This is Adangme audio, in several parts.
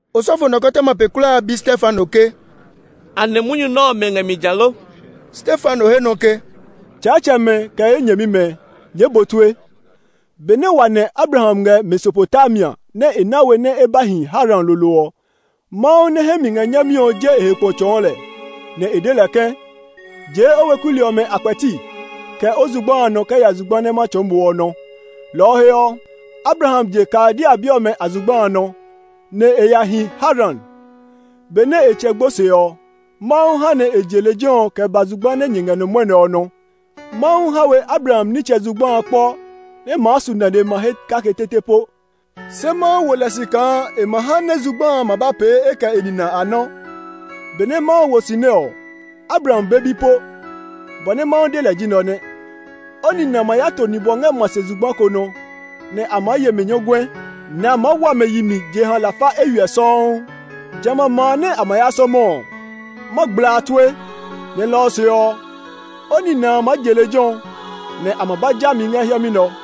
Osɔfo nɔkɔtɔma pe kulaa a bi Stefano ke, “Anɛ munyu nɛ ɔmɛ ngɛ mi ja lo?” Stefano he nɔ ke, “Tsaatsɛmɛ kɛ ye nyɛmimɛ, nyɛɛ bu tue. Benɛ wa nɛ̃ Abraham ngɛ Mesopotamia nɛ e na we nɛ e ba hi Haran lolo ɔ, Mawu nɛ hɛ mi ngɛ nyami ɔ je e he kpo tsɔɔ lɛ, nɛ e de lɛ ke, ‘Jee o weku li ɔmɛ a kpɛti, kɛ o zugba a nɔ kɛ ya zugba nɛ ma tsɔɔ mo ɔ nɔ!’ Lɔ ɔ he ɔ, Abraham je Kaldea bi ɔmɛ a zugba a nɔ, nɛ e ya hi Haran. Benɛ e tsɛ gbo se ɔ, Mawu ha nɛ e je lejɛ ɔ kɛ ba zugba nɛ nyɛ ngɛ nɔ mwɔnɛ ɔ nɔ. Mawu ha we Abraham nitsɛ zugba a kpɔ nɛ maa su nane ma he kake tete po. Se Mawu wo lɛ si kaa e ma ha nɛ zugba a ma ba pee e kɛ e nina a nɔ́. Benɛ Mawu wo si nɛ ɔ, Abraham be bi po. Bɔ nɛ Mawu de lɛ ji nɛ ɔ nɛ: ‘O nina ma ya to nibwɔ ngɛ ma se zugba ko nɔ, nɛ a maa ye mɛ nyɔguɛ, nɛ a maa wa mɛ yi mi jeha lafa eywiɛ sɔuu. Jamɛ a ma a nɛ a ma ya sɔmɔ ɔ, ma gbla a tue; nɛ lɔ ɔ se ɔ, o nina a maa je lejɛ ɔ, nɛ a ma ba ja mi ngɛ hiɛmɛ nɛ ɔ.’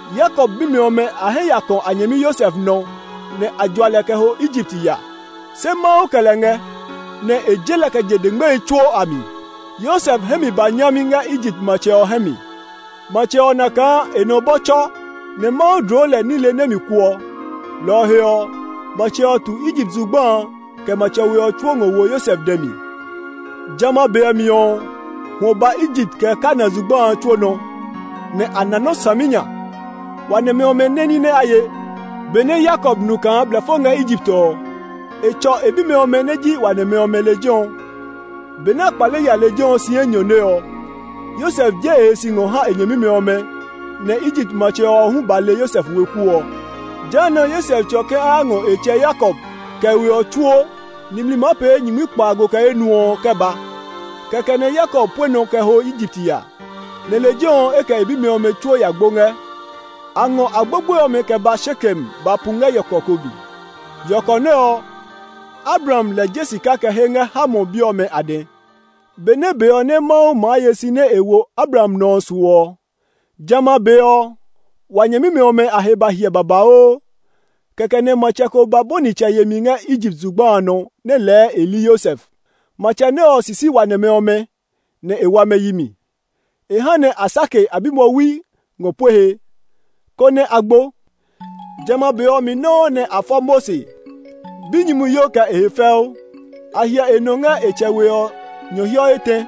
“Yakob bimɛ ɔmɛ a hɛ ya kɔ̃ a nyɛmi Yosef nɔ, nɛ a jua lɛ kɛ ho Egipt ya. Se Mawu kɛ lɛ ngɛ, nɛ e je lɛ kɛ je dengmehi tsuo a mi. Yosef hɛ mi ba nyami ngɛ Egipt matsɛ ɔ hɛ mi. Matsɛ ɔ na kaa e nɔ bɔ tsɔ, nɛ Mawu dloo lɛ nile nɛ mi kuɔ. Lɔ ɔ he ɔ, matsɛ ɔ tu Egipt zugba a, kɛ matsɛ we ɔ tsuo ngɔ wo Yosef dɛ mi. Jamɛ a be ɔ mi ɔ, hwɔ ba Egipt kɛ Kanaan zugba a tsuo nɔ, nɛ a na nɔ́ saminya. Wa nɛmɛ ɔmɛ nɛ́ ní nɛ a ye. Benɛ Yakob nu kaa blɛfo ngɛ Egipt ɔ, e tsɔ e bimɛ ɔmɛ nɛ ji wa nɛmɛ ɔmɛ lejɛ ɔ. Benɛ a kpale ya lejɛ ɔ si enyɔne ɔ, Yosef je e he si ngɔ ha e nyɛmimɛ ɔmɛ, nɛ Egipt matsɛ ɔ hu ba le Yosef weku ɔ. Jehanɛ Yosef tsɔ ke a ya ngɔ e tsɛ Yakob kɛ e we ɔ tsuo, nimli maa pee nyingmi kpaago kɛ enuɔ ɔ kɛ ba. Kɛkɛ nɛ Yakob pue nɔ kɛ ho Egipt ya. Nɛ lejɛ ɔ e kɛ e bimɛ ɔmɛ tsuo ya gbo ngɛ. A ngɔ a gbogbo ɔmɛ kɛ ba Shekem ba pu ngɛ yɔkɔ ko mi. Yɔkɔ nɛ ɔ, Abraham lɛ je sika kɛ he ngɛ Hamor bi ɔmɛ a dɛ. “Benɛ be ɔ nɛ Mawu maa ye si nɛ e wo Abraham ɔ nɔ ɔ su ɔ, jamɛ a be ɔ, wa nyɛmimɛ ɔmɛ a he ba hiɛ babauu. Kɛkɛ nɛ matsɛ ko ba bɔni tsɛ yemi ngɛ Egipt zugba a nɔ nɛ lɛɛ e li Yosef. Matsɛ nɛ ɔ sisi wa nɛmɛ ɔmɛ, nɛ e wa mɛ yi mi. E ha nɛ a sake a bimwɔwi ngɔ pue he, konɛ a gbo. Jamɛ a be ɔ mi nɔuu nɛ a fɔ Mose, binyumuyo kɛ e he fɛu. A hyɛ e nɔ ngɛ e tsɛ we ɔ nyɔhiɔ etɛ;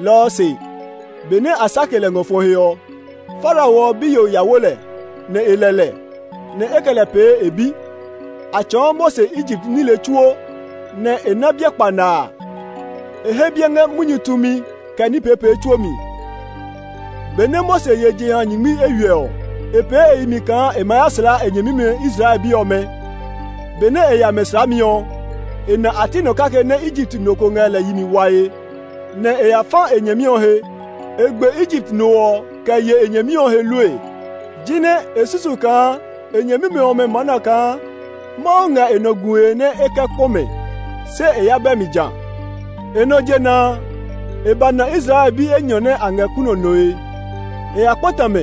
lɔ ɔ se, benɛ a sake lɛ ngɔ fɔ he ɔ, Farao ɔ biyo ya wo lɛ, nɛ e lɛ lɛ; nɛ e kɛ lɛ pee e bi. A tsɔɔ Mose Egipt nile tsuo, nɛ e na biɛ kpanaa; e he biɛ ngɛ munyu tumi kɛ e ní peepee tsuo mi. “Benɛ Mose ye jeha nyingmi eywiɛ ɔ, e pee e yi mi kaa e ma ya slaa e nyɛmimɛ Israel bi ɔmɛ. Benɛ e ya mɛ slaami ɔ, e na a ti nɔ kake nɛ Egipt no ko ngɛ lɛ yi mi wae; nɛ e ya fa e nyɛmi ɔ he. E gbe Egipt no ɔ kɛ ye e nyɛmi ɔ he lue. Jinɛ e susu kaa e nyɛmimɛ ɔmɛ maa na kaa Mawu ngɛ e nɔ gue nɛ e kɛ kpɔ mɛ, se e ya bɛ mi ja. E nɔ jena a, e ba na Israel bi enyɔ nɛ a ngɛ kunɔ nɔe. E ya kpata mɛ,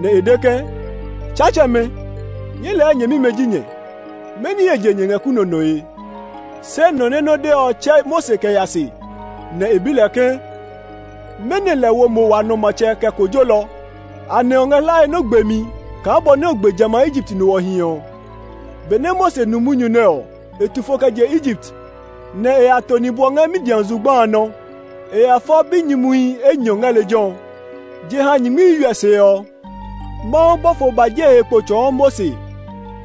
nɛ e de ke, ‘Tsaatsɛmɛ, nyɛɛ lɛɛ nyɛmimɛ ji nyɛ, mɛni he je nyɛ ngɛ kunɔ nɔe?’ Se nɔ nɛ nɔ́ dɛ ɔ tsɛ̃ Mose kɛ ya se, nɛ e bi lɛ ke, ‘Mɛnɔ lɛ wo mo wa nɔ matsɛ kɛ kojolɔ? Anɛ o ngɛ hlae nɛ o gbe mi kaa bɔ nɛ o gbe jamɛ a Egipt no ɔ hiɛ ɔ?’ Benɛ Mose nu munyu nɛ ɔ, e tu fo kɛ je Egipt, nɛ e ya to nibwɔ ngɛ Midian zugba a nɔ. E ya fɔ binyumuhi enyɔ ngɛ lejɛ ɔ. “Jeha nyingmi eywiɛ se ɔ, Mawu bɔfo ba je e he kpo tsɔɔ Mose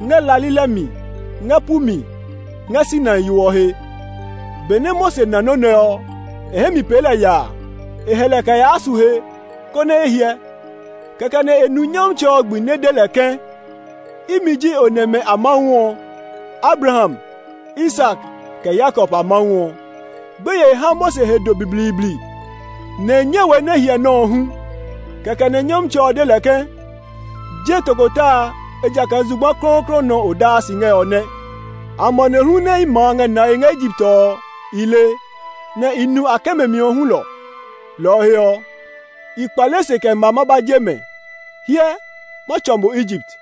ngɛ la lilɛ mi ngɛ pu mi ngɛ Sinai yo ɔ he. Benɛ Mose na nɔ́ nɛ ɔ, e hɛ mi pee lɛ yaa. E hɛ lɛ kɛ yaa su he, konɛ e hyɛ; kɛkɛ nɛ e nu Nyɔmtsɛ ɔ gbi nɛ de lɛ ke, ‘Imi ji o nɛmɛ a Mawu ɔ, Abraham, Isak, kɛ Yakob a Mawu ɔ.’ Gbeye ha Mose he do blibliibli, nɛ e nyɛ we nɛ e hyɛ nɔ́ ɔ hu. Kɛkɛ nɛ Nyɔmtsɛ ɔ de lɛ ke, ‘Je tokota amɛ, ejakaa zugba klɔuklɔu nɔ nɛ o daa si ngɛ ɔ nɛ. Amanehlu nɛ ye ma a ngɛ nae ngɛ Egipt ɔ, i le; nɛ i nu a kɛmɛmi ɔ hulɔ. Lɔ ɔ he ɔ, i kpale se kɛ ma ma ba je mɛ. Hyɛ, ma tsɔ mo Egipt.’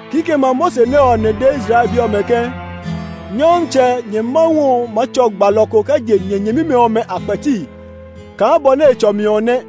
Kikɛmɛ a Mose nɛ ɔ nɛ de Israel bi ɔmɛ ke, ‘Nyɔmtsɛ, nyɛ Mawu ɔ maa tsɔ gbalɔ ko kɛ je nyɛ nyɛmimɛ ɔmɛ a kpɛti kaa bɔ nɛ e tsɔ mi ɔ nɛ.’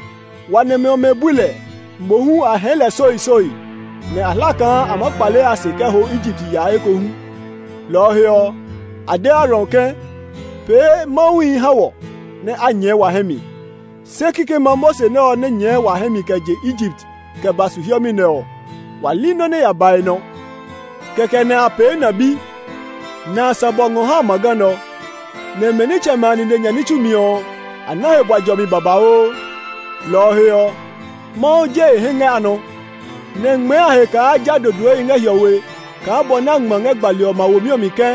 “Wa nɛmɛ ɔmɛ bui lɛ, mohu a hɛɛ lɛ soisoi, nɛ a hla kaa a maa kpale a se kɛ ho Egipt ya ekohu. Lɔ ɔ he ɔ, a de Aaron ke, ‘Pee mawuhi ha wɔ, nɛ a nyɛɛ wa hɛ mi; se kikɛmɛ a Mose nɛ ɔ nɛ nyɛɛ wa hɛ mi kɛ je Egipt kɛ ba su hiɛmɛ nɛ ɔ, wa li nɔ́ nɛ ya ba e nɔ.’ Kɛkɛ nɛ a pee na bi, nɛ a sã bɔ ngɔ ha amaga nɛ ɔ; nɛ mɛ nitsɛmɛ a nine nya ní tsumi ɔ, a na he bua jɔmi babauu. Lɔ ɔ he ɔ. Mawu je e hɛ ngɛ a nɔ, nɛ e ngmɛɛ a he kaa a ja dodoehi ngɛ hiɔwe kaa bɔ nɛ a ngma ngɛ gbali ɔmɛ a womi ɔ mi ke,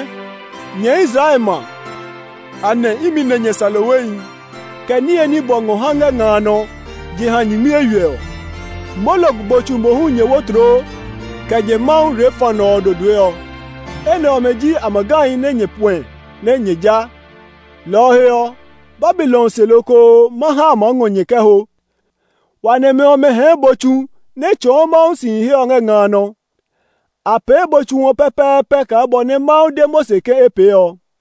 ‘Nyɛ Israel ma, anɛ imi nɛ nyɛ sã lohwehi, kɛ niye ni bɔ ngɔ ha ngɛ nga a nɔ jeha nyingmi eywiɛ ɔ? Molok bo tsu mohu nyɛ wo tloo, kɛ nyɛ mawu Renfan ɔ dodoe ɔ; enɛ ɔmɛ ji amagahi nɛ nyɛ puɛ nɛ nyɛ ja. Lɔ ɔ he ɔ, Babilon se lokoo ma ha a maa ngɔ nyɛ kɛ ho.’ “Wa nɛmɛ ɔmɛ hɛɛ bo tsu nɛ tsɔɔ Mawu sihi he ɔ ngɛ nga a nɔ. A pee bo tsu ɔ pɛpɛɛpɛ kaa bɔ nɛ Mawu de Mose ke e pee ɔ.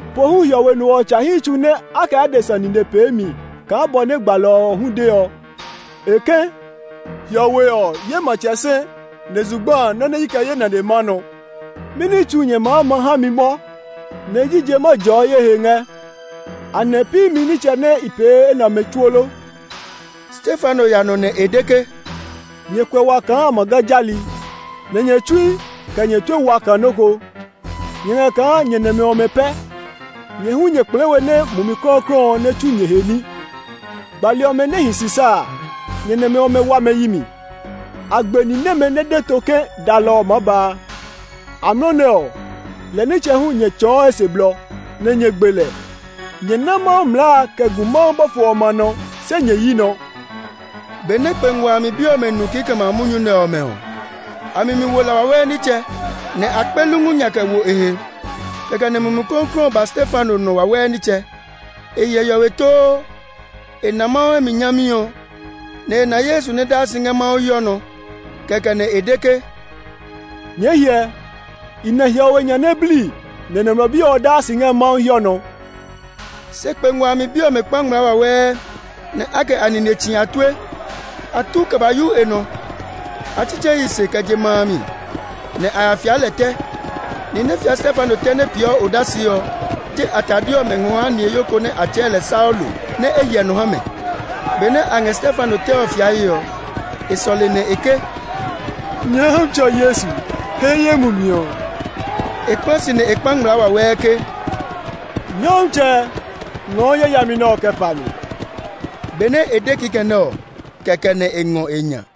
“Pohu Hiɔwe No ɔ tsa hi tsu nɛ a kɛ adesa nine pee mi kaa bɔ nɛ gbalɔ ɔ hu de ɔ. E ke, ‘Hiɔwe ɔ, ye matsɛ sɛ, nɛ zugba a, nɔ́ nɛ i kɛ ye nane maa nɔ. Mɛni tsu nyɛ maa ma ha mi mɔ? Nɛ jije ma jɔɔ ye he ngɛ? Anɛ pi imi nitsɛ nɛ i pee enɛ ɔmɛ tsuo lo?’” Stefano ya nɔ nɛ e de ke, “Nyɛ kuɛ wa kaa amaga jali, nɛ nyɛ tsui, kɛ nyɛ tue wa kaa nɔ́ ko! Nyɛ ngɛ kaa nyɛ nɛmɛ ɔmɛ pɛ! Nyɛ hu nyɛ kplɛɛ we nɛ Mumi Klɔuklɔu ɔ nɛ tsu nyɛ he ní. Gbali ɔmɛ nɛ hi si sa a, nyɛ nɛmɛ ɔmɛ wa mɛ yi mi. A gbe ni nɛmɛ nɛ de to ke dalɔ ɔ maa ba a. Amlɔ nɛ ɔ, lɛ nitsɛ hu nyɛ tsɔɔ e se blɔ, nɛ nyɛ gbe lɛ. Nyɛ ná Mawu mlaa a kɛ gu Mawu bɔfo ɔmɛ a nɔ, se nyɛ yi nɔ.” Benɛ kpe ngua a mi bi ɔmɛ nu kikɛmɛ a munyu nɛ ɔmɛ ɔ, a mi mi wo la wawɛɛ nitsɛ, nɛ a kpe lungu nya kɛ wo e he. Kɛkɛ nɛ Mumi Klɔuklɔu ɔ ba Stefano nɔ wawɛɛ nitsɛ. E hyɛ hiɔwe too; e na Mawu hɛ mi nyami ɔ, nɛ e na Yesu nɛ daa si ngɛ Mawu hiɔ nɔ. Kɛkɛ nɛ e de ke, “Nyɛɛ hyɛ, i na hiɔwe nya nɛ bli nɛ Nɔmlɔ Bi ɔ daa si ngɛ Mawu hiɔ nɔ!” Se kpe ngua a mi bi ɔmɛ kpa ngmlaa wawɛɛ, nɛ a kɛ a nine tsi a tue. A tu kɛ ba yu e nɔ. A tsitsɛɛ e yi se kɛ je ma a mi, nɛ a ya fia lɛ tɛ. Nihi nɛ fia Stefano tɛ ɔ nɛ peeɔ odase ɔ, je a tade ɔmɛ ngɔ ha niheyo ko nɛ a tsɛɛ lɛ Saulo, nɛ e hyɛ nɔ ha mɛ. Benɛ a ngɛ Stefano tɛ ɔ fiae ɔ, e sɔle, nɛ ke, “Nyɔmtsɛ Yesu, he ye mumi ɔ!” E kpla si, nɛ e kpa ngmlaa wawɛɛ ke, “Nyɔmtsɛ, ngɔɔ yayami nɛ ɔ kɛ pa mɛ!” Benɛ e de kikɛ nɛ ɔ, kɛkɛ nɛ e ngɔ e nya.